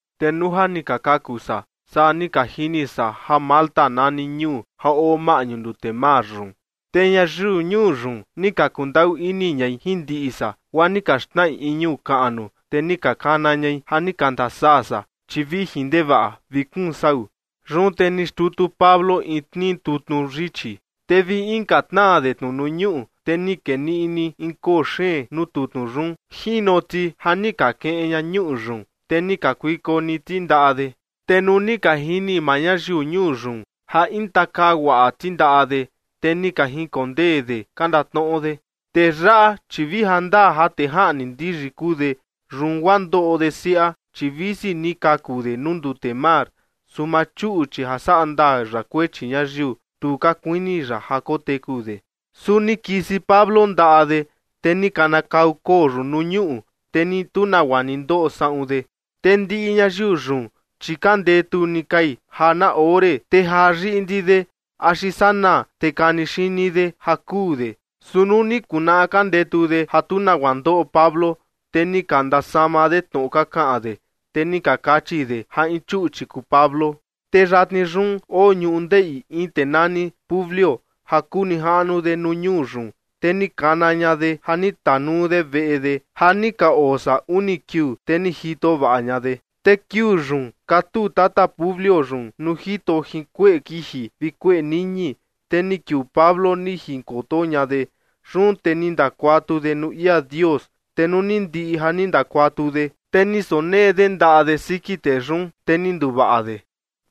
Te nuu ja ni ka kaku san, saa ni ka jini san ja Malta nani ñuu ja oo maꞌñu ndute mar yun. Te ñayiu ñuu yun ni ka kundaꞌu ini ñai jin ndiꞌi san, guaa ni ka xnaꞌi in ñuꞌu kaꞌnu, te ni ka kana ñai ja ni ka ndasaa san, chi vijin ndevaꞌa vi kuun sau. Yun te ni xtutu Pablo in tnii tutnu yichi, te vi inka tnaa de tnu nuu ñuꞌu, te ni kee niꞌni ni in koo xeen nuu tutnu yun. Jino ti ja ni ka kiꞌin ña ñuꞌu yun, te ni kakuiko ni ti ndaꞌa de. Te nuu ni ka jini maa ñayiu ñuu yun ja intakaa guaꞌa ti ndaꞌa de, te ni ka jinkondee de ka ndatnoꞌo de: ―Tee yaꞌa, chi vi ja ndaa ja tee jaꞌni ndiyi kuu de, yun guaa ndoꞌo de siaꞌa, chi visi ni kaku de nuu ndute mar, su maa chuꞌchi ja saꞌa ndaa ya kuechi ñayiu, tu ka kuini ya ja koteku de. Su ni kisi Pablo ndaꞌa de, te ni kanakau koo yun nuu ñuꞌu, te ni tu nagua ni ndoꞌo saꞌun de. Te ndiꞌi ñayiu yun, chi ka ndetu ni kai ja na ore, te jaa yiꞌndi de axi sanaa te kani xini de ja kuu de. Su nuu ni kunaꞌa ka ndetu de ja tu nagua ndoꞌo Pablo, te ni ka ndasama de tnoꞌo ka kaꞌan de, te ni ka kachi de ja in chuꞌchi kuu Pablo. Te yatni yun oo ñundeꞌi in tee nani Publio ja kuu nijaꞌnu de nuu ñuu yun. Te ni kana ña de ja ni tanuu de veꞌe de ja ni ka oo san uni kiuu, te ni jito vaꞌa ña de. Te kiuu yun katuu tata Publio yun nuu jito jin kueꞌe kiji vi kueꞌe niñi, te ni kiuu Pablo ni jinkoto ña de. Yun te ni ndakuatu de nuu ia Dios. Te nuu ni ndiꞌi ja ni ndakuatu de, te ni sonee de ndaꞌa de siki tee yun, te ni nduvaꞌa de.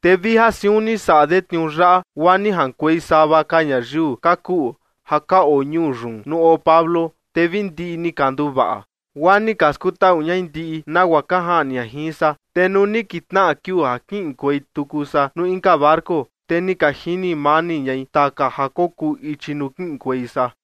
Te vi ja siun ni saꞌa de tniuu yaꞌa, guaa ni jaꞌankuei sava ka ñayiu ka kuꞌu ja ka oo ñuu yun nuu oo Pablo, te vi ndiꞌi ni ka nduvaꞌa. Guaa ni ka skutaꞌu ñai ndiꞌi nagua ka jaꞌni ña jin san. Te nuu ni kitnaꞌa kiuu ja kiꞌinkuei tuku san nuu inka barco, te ni ka jini mani ñai taka ja kokuu ichi nuu kiꞌinkuei san.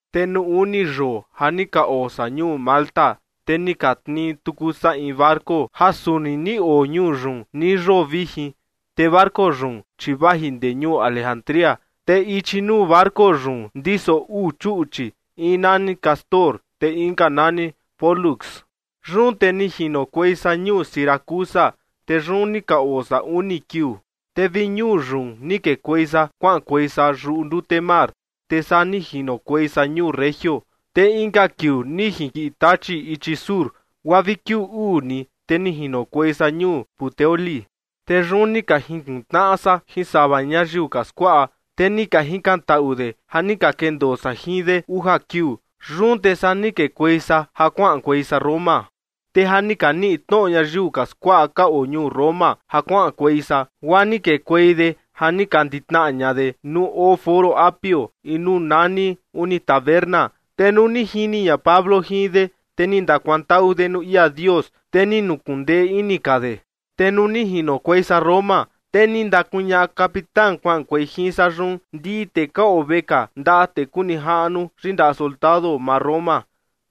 Te nuu uni yoo ja ni ka oo san ñuu Malta, te ni ka tnii tuku san in barco ja suni ni oo ñuu yun nii yoo vijin. Te barco yun, chi vaji ndee ñuu Alejandría, te ichi nuu barco yun ndiso uu chuꞌchi, in nani Cástor te inka nani Pólux. Yun te ni jinokuei san ñuu Siracusa, te yun ni ka oo san uni kiuu. Te vi ñuu yun ni kekuei san kuaꞌankuei san yuꞌu ndute mar, te saa ni jinokuei san ñuu Regio. Te inka kiuu ni jinkiꞌi tachi ichi sur, guaa vi kiuu uu ni, te ni jinokuei san ñuu Puteoli. Te yun ni ka jinkuntnaꞌa san jin sava ñayiu ka skuaꞌa, te ni ka jikantaꞌu de ja ni ka kendoo san jin de uja kiuu. Yun te saa ni kekuei san ja kuaꞌankuei san Roma. Te ja ni ka niꞌi tnoꞌo ñayiu ka skuaꞌa ka oo ñuu Roma ja kuaꞌankuei san, guaa ni kekuei de ja ni ka nditnaꞌa ña de nuu oo Foro Apio, in nuu nani Uni Taberna. Te nuu ni jini ña Pablo jin de, te ni ndakuantaꞌu de nuu ia Dios, te ni nukuꞌun ndee ini ka de. Te nuu ni jinokuei san Roma, te ni ndakuñaꞌa capitán kuaꞌankuei jin san yun ndiꞌi tee ka oo vekaa ndaꞌa tee kuu nijaꞌnu yindaꞌa soldado maa Roma.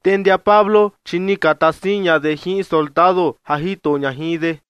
Te ndia Pablo, chi ni ka taa siin ña de jin in soldado ja jito ña jin de.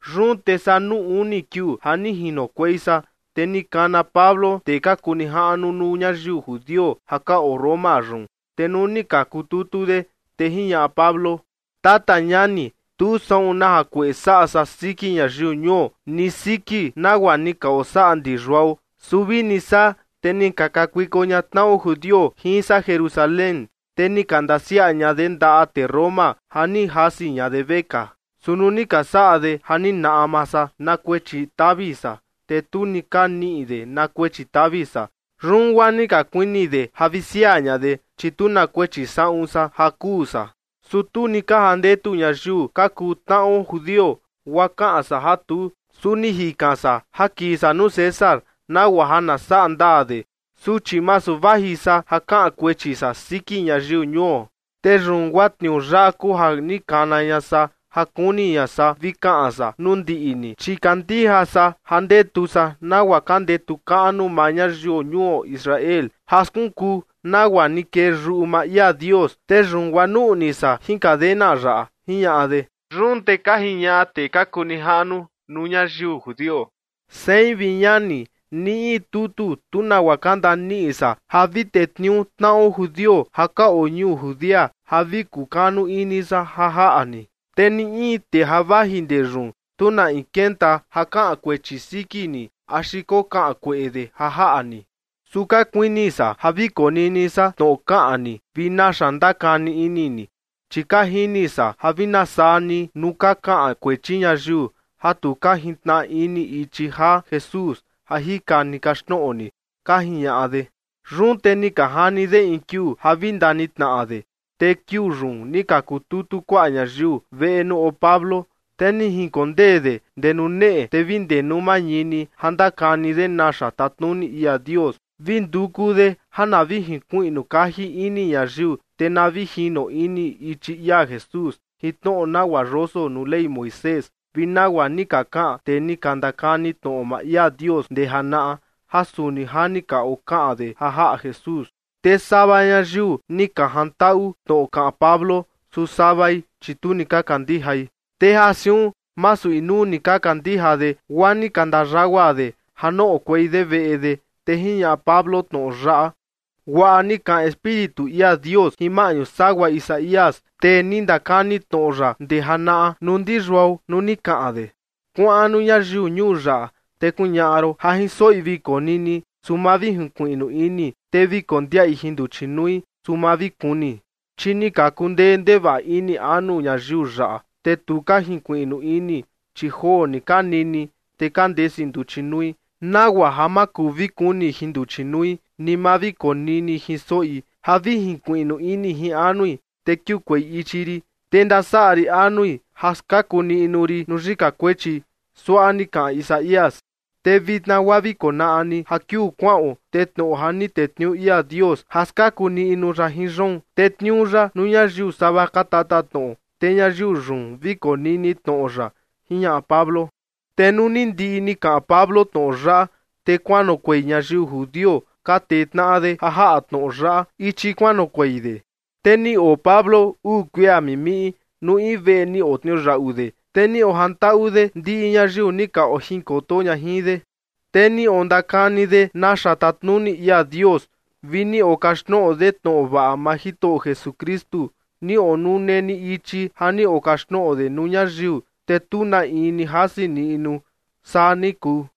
Yun te saa nuu uni kiuu ja ni jinokuei san, te ni kana Pablo tee ka kuu nijaꞌnu nuu ñayiu judio ja ka oo Roma yun. Te nuu ni ka kututu de, te jiñaꞌa Pablo: ―Tata ñani, tu saꞌun na jakueꞌe saꞌa san siki ñayiu ñuo, ni siki nagua ni ka osaꞌa ndi yuao. Su vini saa, te ni ka kakuiko ña tnaꞌo judio jin san Jerusalén, te ni ka ndasiaꞌa ña de ndaꞌa tee Roma ja ni jasi ña de vekaa. Su nuu ni ka saꞌa de ja ni naꞌma san na kuechi tavi san, te tu ni ka niꞌi de na kuechi tavi san. Yun guaa ni ka kuini de ja vi siaa ña de, chi tu na kuechi saꞌun san ja kuu san. Su tu ni ka jandetu ñayiu ka kuu tnaꞌo judio, guaa kaꞌan san a tuu, su ni jikan san ja kii san nuu César, nagua ja na saꞌa ndaa de, su chi masu vaji san ja kaꞌan kuechi san siki ñayiu ñuo. Te yun guaa tniuu yaꞌa kuu ja ni kana ña san ja kuni ña san vi kaꞌan san nuu ndiꞌi ni, chi kandija san ja ndetu san nagua ka ndetu kaꞌnu maa ñayiu ñuo Israel ja skunkuu nagua ni kee yuꞌu maa ia Dios, te yun guaa nuꞌni san jin cadena yaꞌa ―jiñaꞌa de. Yun te ka jiñaꞌa tee ka kuu nijaꞌnu nuu ñayiu judio: ―Sein, vi ñani, ni in tutu tu nagua ka ndaniꞌi san ja vi tetniuu tnaꞌo judio ja ka oo ñuu Judea ja vi kukanu ini san ja jaꞌa ni. Te ni in tee ja vaji ndee yun, tu na in kenta ja kaꞌan kuechi siki ni axi kokaꞌan kueꞌe de ja jaꞌa ni. Su ka kuini san ja vi konini san tnoꞌo kaꞌan ni vi naxa ndakani ini ni, chi ka jini san ja vi na saa ni nuu ka kaꞌan kuechi ñayiu ja tu ka jintnaꞌa ini ichi jaa Jesús ja jika ni kaxtnoꞌo ni ―ka jiñaꞌa de. Yun te ni ka jani de in kiuu ja vi ndanitnaꞌa de. Te kiuu yun ni ka kututu kuaꞌa ñayiu veꞌe nuu oo Pablo, te ni jinkondee de ndee nuu neꞌe, te vi ndee nuu mañini ja ndakani de naxa tatnuni ia Dios, vi nduku de ja na vi jinkuiꞌnu kaji ini ñayiu, te na vi jino ini ichi ia Jesús jin tnoꞌo nagua yoso nuu Ley Moisés vi nagua ni ka kaꞌan tee ni ka ndakani tnoꞌo maa ia Dios ndee janaꞌa, ja suni ja ni ka okaꞌan de ja jaꞌa Jesús. Te sava ñayiu ni ka jantaꞌu tnoꞌo kaꞌan Pablo, su savai, chi tu ni ka kandijai. Te ja siun masu inuu ni ka kandija de, guaa ni ka ndayagua de ja noꞌokuei de veꞌe de, te jiñaꞌa Pablo tnoꞌo yaꞌa: ―Guaꞌa ni kaꞌan Espíritu ia Dios jin maꞌñu sagua Isaías, tee ni ndakani tnoꞌo ya ndee janaꞌa, nuu ndi yuao nuu ni kaꞌan de: Kuaꞌan nuu ñayiu ñuu yaꞌa, te kuñaꞌa ron: Ja jin soꞌi vi konini, su ma vi jinkuiꞌnu ini. Te vi kondiaꞌi jin nduchi nui, su ma vi kuni. Chi ni ka kundee ndevaꞌa ini anu ñayiu yaꞌa, te tu ka jinkuiꞌnu ini, chi joo ni ka nini, te ka ndesi nduchi nui nagua ja ma kuu vi kuni jin nduchi nui ni ma vi konini jin soꞌi, ja vi jinkuiꞌnu ini jin anui, te kiukuei ichi rin, te ndasaꞌa rin anui ja skaku niꞌnu rin nuu yika kuechi, suaꞌa ni kaꞌan Isaías. ’Te vitna guaa vi konaꞌa ni ja kiuu kuaꞌon, te tnoꞌo ja ni tetniuu ia Dios ja skaku niꞌnu ya jin yoon, tetniuu ya nuu ñayiu sava ka tatatnoꞌo, te ñayiu yun vi konini tnoꞌo ya ―jiñaꞌa Pablo. Te nuu ni ndiꞌi ni kaꞌan Pablo tnoꞌo yaꞌa, te kuanoꞌokuei ñayiu judio ka tee tnaꞌa de ja jaꞌa tnoꞌo yaꞌa ichi kuanoꞌokuei de. Te ni oo Pablo uu kuia mimiꞌi nuu in veꞌe ni otniuyaꞌu de, te ni ojantaꞌu de ndiꞌi ñayiu ni ka ojinkoto ña jin de. Te ni ondakani de naxa tatnuni ia Dios vi ni okaxtnoꞌo de tnoꞌo vaꞌa maa Jitoꞌo Jesukristu, ni onune ni ichi ja ni okaxtnoꞌo de nuu ñayiu, te tu na in ni jasi niꞌnu. Saa ni kuu.